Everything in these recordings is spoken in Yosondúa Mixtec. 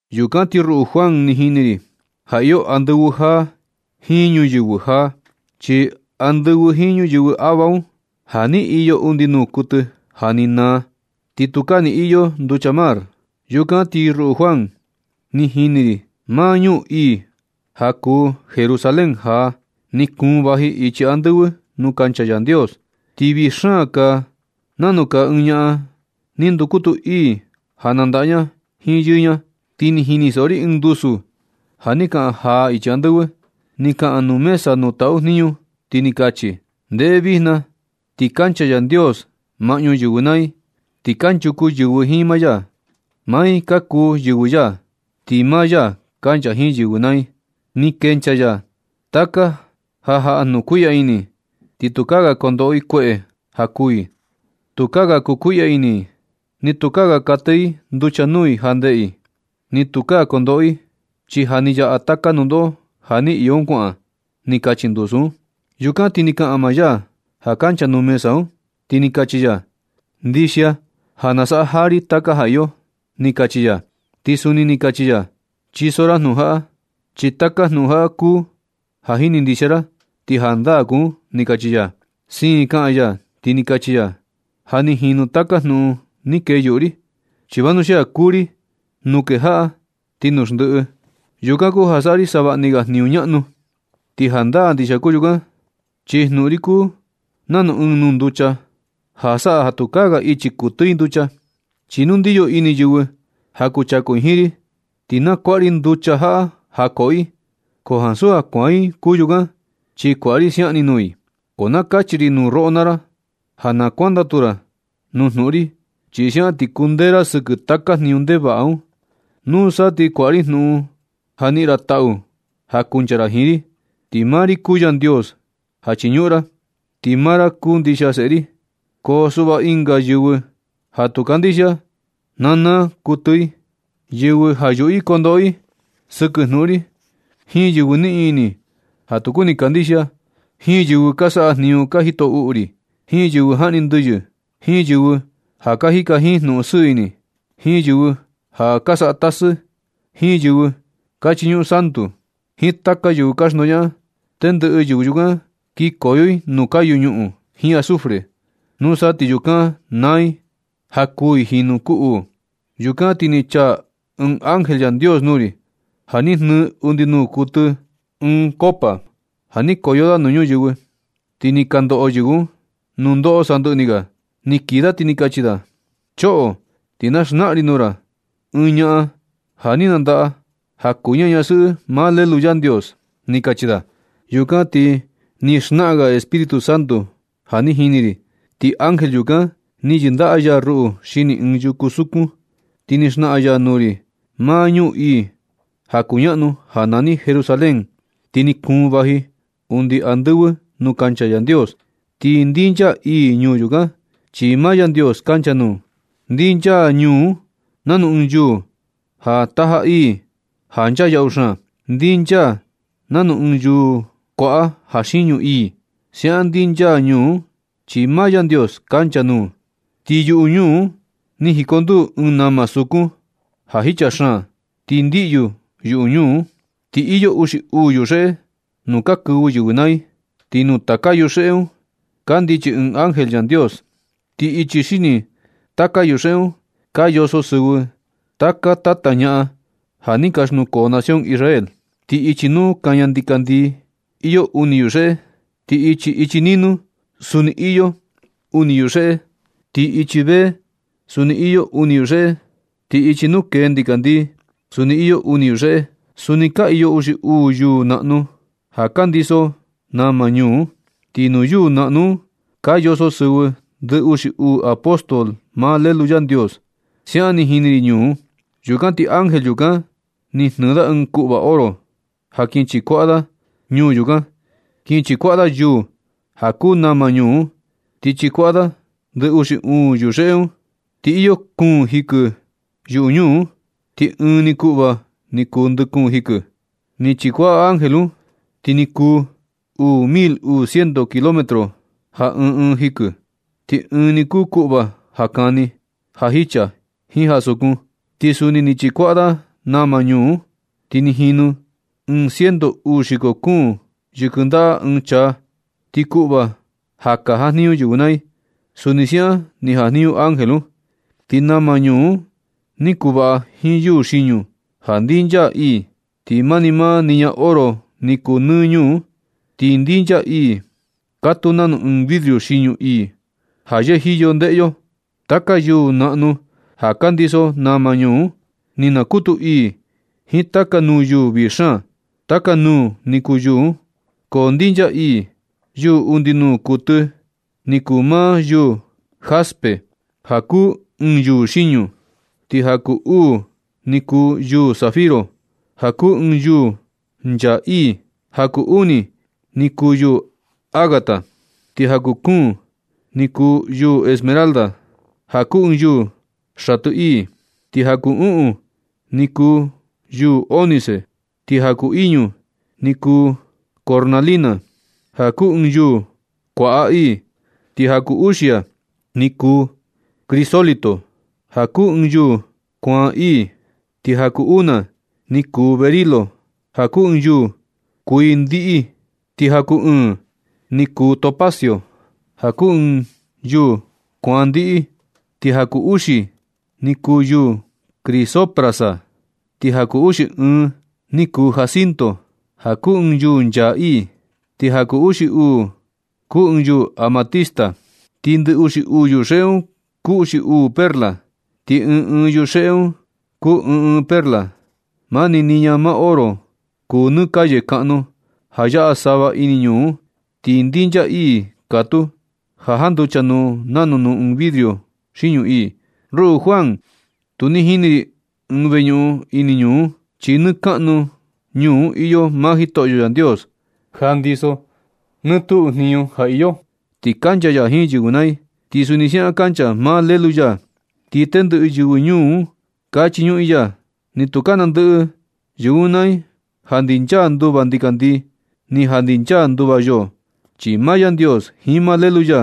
Yukan ti ruꞌu Juan, ni jini ri ja iyo andɨvɨ jaa jiin ñuyɨvɨ jaa. Chi andɨvɨ jiin ñuyɨvɨ ava un, ja ni iyo undi nuu kuɨtɨ ja ni naa. Ti tukaa ni iyo nducha mar. Yukan ti ruꞌu Juan, ni jini ri maa ñuu ii ja kuu Jerusalén jaa. Ni kuun vaji ichi andɨvɨ nuu kancha Yandios. Ti vii xaan kaa nanu kaa ɨɨn ñaꞌan ni ndukutu ii ja nandaꞌa ña jiin yɨɨ ña. Ti ni jinisoꞌo ri ɨɨn ndusu ja ni kaꞌan jaa ichi andɨvɨ. Ni kaꞌan nuu mesa nuu taꞌu jniñu, ti ni kachi: ―¡Ndeꞌe! Vijna ti kancha Yandios maꞌñu yɨvɨ naa i. Ti kanchuku yɨvɨ jiin maa ya. Maa i ka kuu yɨvɨ ya, ti maa ya kancha jiin yɨvɨ naa i. Ni kenchaa ya taka ja jaꞌa jnukuiꞌya ini, ti tukaa ga kondoꞌo i kueꞌe ja kuū i. Tukaa ga kukuiꞌya ini i, ni tukaa ga katɨ i nducha nuu i ja ndeꞌe i. Ni tukaa kondoꞌo i, chi ja ni yaꞌa taka nundoꞌo ja ni iyo un kuaꞌan ―ni kachi ndusu un. Yukan ti ni kaꞌan maa ya ja kancha nuu mesa un, ti ni kachi ya: ―Ndixia ja nasaꞌa jaa ri taka ja iyo ―ni kachi ya. Ti suni ni kachi ya: ―Chiso ra jnuꞌun jaꞌa, chi taka jnuꞌun jaꞌa kuu ja jini ndixia ra ti jandaa kuu un ―ni kachi ya. Siin kaꞌan ya, ti ni kachi ya: ―Ja ni jinu taka jnuꞌun ni kee yuꞌu ri. Chi vanuxia kuu ri letra A jiin Z nuu kejaꞌa ti nuu xndiꞌi. Yukan kuu ja saꞌa ri savaꞌni ga jniñu ñaꞌnu. Ti jandaa ndixia kuu yukan, chi jnuꞌun ri kuu nanu ɨɨn nuu nducha ja saꞌa ja tukaa ga ichi kuɨtɨ i nducha. Chi nu kundiyo ini yɨvɨ ja kuchaku i jiin ri, ti na kuaꞌa ri nducha jaꞌa ja koꞌo i, ko ansu ja kuaan i kuu yukan, chi kuaꞌa ri siaꞌan ni nuu i. Ko na kachi ri nuu roꞌo naa ra ja na kuandatu ra nuu jnuꞌun ri, chi siaꞌan ti kundee ra sɨkɨ taka jniñu ndevaꞌa un. Nusa ti kuaꞌa ri jnuꞌun ja niꞌin ra taꞌu ja kuncha ra jiin ri. Ti maa ri kuu Yandios ja chiñuꞌun ra, ti maa ra kuu ndixia seꞌe ri. Ko suꞌva ɨnga yɨvɨ ja tu kandixia, na naa kuɨtɨ i. Yɨvɨ ja yuꞌu i kondoꞌo i sɨkɨ jnuꞌun ri, jiin yɨvɨ niꞌin ini ja tu kuni kandixia, jiin yɨvɨ ka saꞌa jniñu ja jito uꞌu ri, jiin yɨvɨ jaꞌni ndɨyɨ, jiin yɨvɨ ja ka jika jiin jnuꞌun sɨɨ ini, jiin yɨvɨ ja ka saꞌa tasɨ, jiin yɨvɨ ka chiñuꞌun santu, jiin taka yɨvɨ ka xndoñaꞌan, tendɨꞌɨ yɨvɨ yukan kinkoyo i nuu kayu ñuꞌun jiin azufre. Nusa ti yukan na naa i, ja kuū i jinu kuu uu. Yukan ti ni chaa ɨɨn ángel Yandios nuu ri, ja ni jnɨɨ undi nuu kuɨtɨ ɨɨn koꞌo ja ni koyo da nuu ñuyɨvɨ, ti ni ka ndoꞌo yɨvɨ un nundoꞌo sandɨꞌɨ ni ga. Ni kii da ti ni kachi da: ―¡Choꞌo! Ti na xnaꞌan ri nuu ra ɨɨn ñaꞌan ja ni nandaꞌa, ja kuu ña ñasɨꞌɨ maa Lelu Yandios ―ni kachi da. Yukan ti ni xnaꞌan ga Espíritu Santo ja ni jini ri, ti ángel yukan ni yɨndaꞌa ya ruꞌu xini ɨɨn yuku sukun. Ti ni xnaꞌan ya nuu ri maa ñuu ii ja kuñaꞌnu ja nani Jerusalén. Ti ni kuun vaji undi andɨvɨ nuu kancha Yandios. Ti ndinchaa ii ñuu yukan, chi maa Yandios kancha nuu. Ndinchaa ñuu un nanu ɨɨn yuu ja taja ii ja nchaa yaꞌu xaan. Ndinchaa nanu ɨɨn yuu kuaꞌa ja xiñu ii. Siaꞌan ndinchaa ñuu un chi maa Yandios kancha nuu. Ti yuꞌu ñuu un ni jikonduu ɨɨn nama sukun ja jicha xaan, ti ndiꞌyu yuꞌu ñuu un. Ti iyo uxi uu yuxeꞌe nuu ka kɨvɨ yɨvɨ naa i. Ti nuu taka yuxeꞌe un kandichi ɨɨn ángel Yandios. Ti ichi xini taka yuxeꞌe un ka yoso sɨvɨ taka tata ñaꞌan ja ni ka xnukoo nación Israel. Ti ichi nuu kaña ndikandii iyo uni yuxeꞌe. Ti ichi ichi ni nuu suni iyo uni yuxeꞌe. Ichi ichi vee suni iyo uni yuxeꞌe. Ti ichi nuu kee ndikandii suni iyo uni yuxeꞌe. Suni ka iyo uxi uu yuu naꞌnu ja ka ndiso nama ñuu un. Ti nuu yuu naꞌnu un ka yoso sɨvɨ ndɨ uxi uu apóstol maa Lelu Yandios. Siaꞌan ni jini ri ñuu un. Yukan ti ángel yukan, ni jnɨɨ da ɨɨn kuꞌva oro ja kin chikuaꞌa da ñuu yukan. Kin chikuaꞌa da yuu ja kuu nama ñuu un. Ti chikuaꞌa da ndɨ uxi uu yuxeꞌe un. Ni iyo kuun jikɨ yuꞌu ñuu un, ti ɨɨn ni kuꞌva ni kuu ndɨ kuun jikɨ. Ni chikuaꞌa ángel un, ti ni kuu uu mil uu ciento kilómetro ja ɨɨn ɨɨn jikɨ. Ti ɨɨn nuu ni kuꞌva ja kani, ja jicha, jiin ja sukun. Ti suni ni chikuaꞌa da nama ñuu un. Ti ni jinu ɨɨn ciento uu xiko kuun yɨkɨ ndaꞌa ɨɨn chaa. Ti kuꞌva ja ka jajniñu yɨvɨ naa i, suni siaꞌan ni jajniñu ángel un. Ti nama ñuu un ni kuvaꞌa jiin yuu xiñu ja ndinchaa ii. Ti mani maa niña oro ni kuu nɨ ñuu un, ti ndinchaa ii katuu nanu ɨɨn vidrio xiñu ii ja yɨjiyo ndeꞌe yo. Taka yuu naꞌnu ja ka ndiso nama ñuu un, ni nakutu ii jiin taka nuu yuu vii xaan. Taka nuu ni kuu yuu un, ko ndinchaa ii. Yuu undi nuu kuɨtɨ ni kuu maa yuu jaspe, ja kuu ɨɨn yuu xiñu. Ti ja kuu uu ni kuu yuu zafiro, ja kuu ɨɨn yuu nchaa ii. Ja kuu uni ni kuu yuu ágata. Ti ja kuu kuun ni kuu yuu esmeralda, ja kuu ɨɨn yuu xatɨ ii. Ti ja kuu uꞌun ni kuu yuu ónice. Ti ja kuu iñu ni kuu cornalina, ja kuu ɨɨn yuu kuaꞌa ii. Ti ja kuu uxia ni kuu crisólito, ja kuu ɨɨn yuu kuaan ii. Ti ja kuu una ni kuu berilo, ja kuu ɨɨn yuu kuii ndiꞌi. Ti ja kuu ɨɨ̄n ni kuu topacio, ja kuu ɨɨn yuu kuaan ndiꞌi. Ti ja kuu uxi ni kuu yuu crisoprasa. Ti ja kuu uxi ɨɨn ni kuu jacinto, ja kuu ɨɨn yuu nchaa ii. Ti ja kuu uxi uu ni kuu ɨɨn yuu amatista. Ti ndɨ uxi uu yuxeꞌe un kuu uxi uu perla. Ti ɨɨn ɨɨn yuxeꞌe un kuu ɨɨn ɨɨn perla. Mani niña maa oro kuu nɨ calle kaꞌnu ja yaꞌa sava ini ñuu un. Ti ndinchaa ii katuu ja janducha nuu nanu nuu ɨɨn vidrio xiñu ii. Ruꞌu Juan, tu ni jini ri ɨɨn veñuꞌun ini ñuu un, chi nɨ kaꞌnu ñuu un iyo maa Jitoꞌyo Yandios ja ndiso nɨ tuꞌu jniñu ja iyo. Ti kancha ya jiin yɨvɨ naa i. Ti suni siaꞌan kancha maa Lelu ya. Ti tendɨꞌɨ yɨvɨ ñuu un ka chiñuꞌun i ya. Ni tu nandɨꞌɨ yɨvɨ un naa i ja ndinchaa nduva ndikandii ni ja ndinchaa nduva yoo, chi maa Yandios jiin maa Lelu ya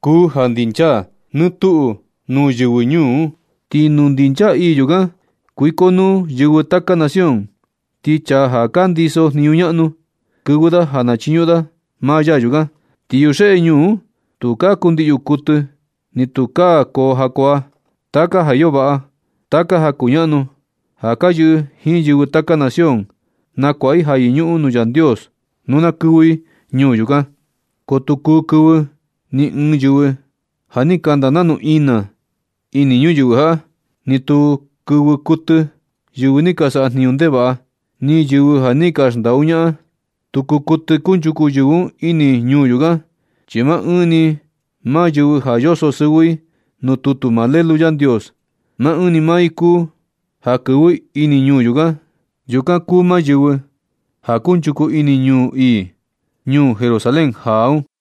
kuu ja xndinchaa nɨ tuꞌu nuu yɨvɨ ñuu un. Ti nuu ndinchaa ii yukan kuikonuu yɨvɨ taka nación. Ti chaa ja ka ndisojniñu ñaꞌnu kɨvɨ da ja chiñuꞌun da maa ya yukan. Ti yuxeꞌe ñuu un tukaa kundiꞌyu kuɨtɨ, ni tukaa koo jakuaa. Taka ja iyo vaꞌa, taka ja kuñaꞌnu ja ka yɨꞌɨ jiin yɨvɨ taka nación, nakuaꞌa i ja yɨñuꞌun nuu Yandios nuu na kɨvɨ i ñuu yukan. Ko tu kuu kuɨtɨ kɨvɨ ɨɨn yɨvɨ ja ni kanda nanu ina ini ñuyɨvɨ jaꞌa. Ni tu kɨvɨ kuɨtɨ yɨvɨ ni ka saꞌa jniñu ndevaꞌa, ni yɨvɨ ja ni xndaꞌu jnaꞌan. Tu kuu kuɨtɨ kunchuku yɨvɨ un ini ñuu yukan. Chi maa ɨɨn maa yɨvɨ ja yoso sɨvɨ i nuu tutu maa Lelu Yandios, maa ɨɨn maa i kuu ja kɨvɨ ini ñuu yukan. Yukan kuu maa yɨvɨ ja kunchuku ini ñuu ii, ñuu Jerusalén jaa un.